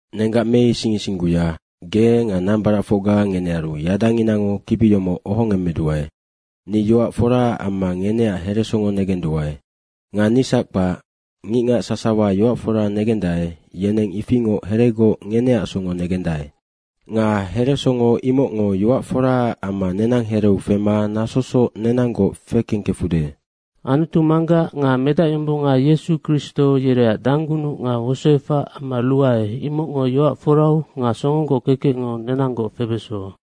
Nenggac meising isingguya, ge nga nambaracfocga ngenearu yadanginango kibi yomoc ohongemmeduae. Ni yoac foraac amma ngeneac heresongo negenduae. Nga nisac kpac, ngicngac sasawa yoac fora negendae, yeneng ifingoc heregoc ngeneac songo negendae. Nga heresongo imocngo yoac foraac amma nenang hereu fema nasosoc nenanggoc fekengkefude. Anutu Manggac nga Medacyombonga Yesu Kristo, yereac danggunuc nga wosoefac amma ruae, imocngo yoac forau nga songogoc kekecngo nenanggoc febeso.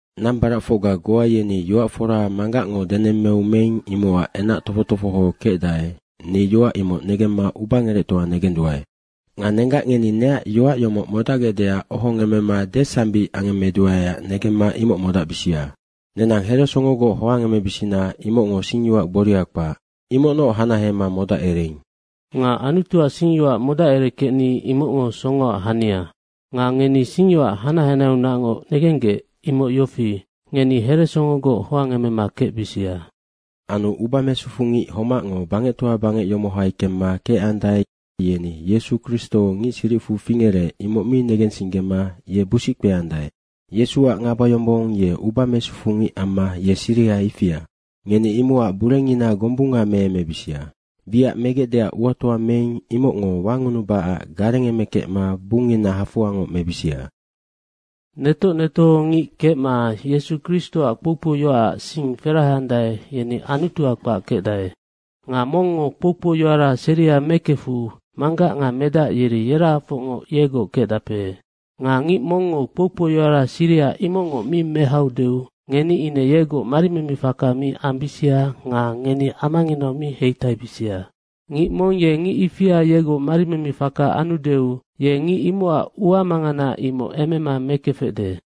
Nambaracfocga goa yeni yoac fora Manggacngo denemmeu meing, imocac enac tofoc tofoho kecdae, ni yoac imoc negemma ubangerectoa negenduae. Nga nenggac, ngeni neac yoac yomoc modacgecdeac ohongemmema desambic angemmeduaeac negemma imoc modacbisia. Nenang heresongogoc hoangemebisina, imocngo singyoac gboria kpac. Imocnoc hanahema modacereing. Nga Anutuac singyoac modacerekecni imocngo songoac hania. Nga ngeni singyoac hanac hanaheaunacngoc negenggec, imoc yofi, ngeni heresongogoc hoangemema kecbisia. Anu uba mesufungic homacngo bangectoa bangec yomohai kemma kecandae, yeni Yesu Kristo ngic siricfu fingerec, imoc mi negensinggema ye busic kpeandae. Yesuac ngabayombong, ye uba mesufungic amma ye siriha ifia. Ngeni imocac burengina gombunga meemebisia. Wiac megecdeac uatoa meing, imocngo wangunubacac garengemekecma bungngina hafoangoc mebisia. Netoc netohongic kecma Yesu Kristoac kpoukpou yoacac sing feraheandae, yeni Anutua kpac kecdae. Nga mongngo kpoukpou yoara seria mekefu Manggac nga Medac yeri yerahafocngoc yegoc kecdape. Nga ngic mongngo kpoukpou yoara siriha imocngoc mi mehaudeu ngeni ine yegoc mari meme faka mi ambisia nga ngeni amanginau mi heitaibisia. Ngic mong ye ngic ifia yegoc mari meme faka anudeu, ye ngic imocac ua mangana, imoc emema mekefecde.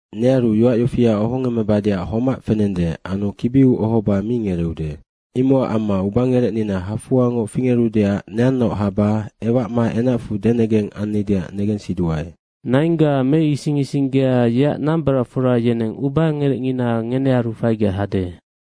Nearu yoac yofia ohongemmebadeac homac fenende, anu kibiu ohoba mi ngereeude. Imocac amma ubangerecnina hafoangoc fingerudeac neannaoc haba ewacma enacfu denegeng annideac negensiduae. Naingga meising isinggea, yeac nambaracfora yeneng ubangerecngina ngenearu faigec hade.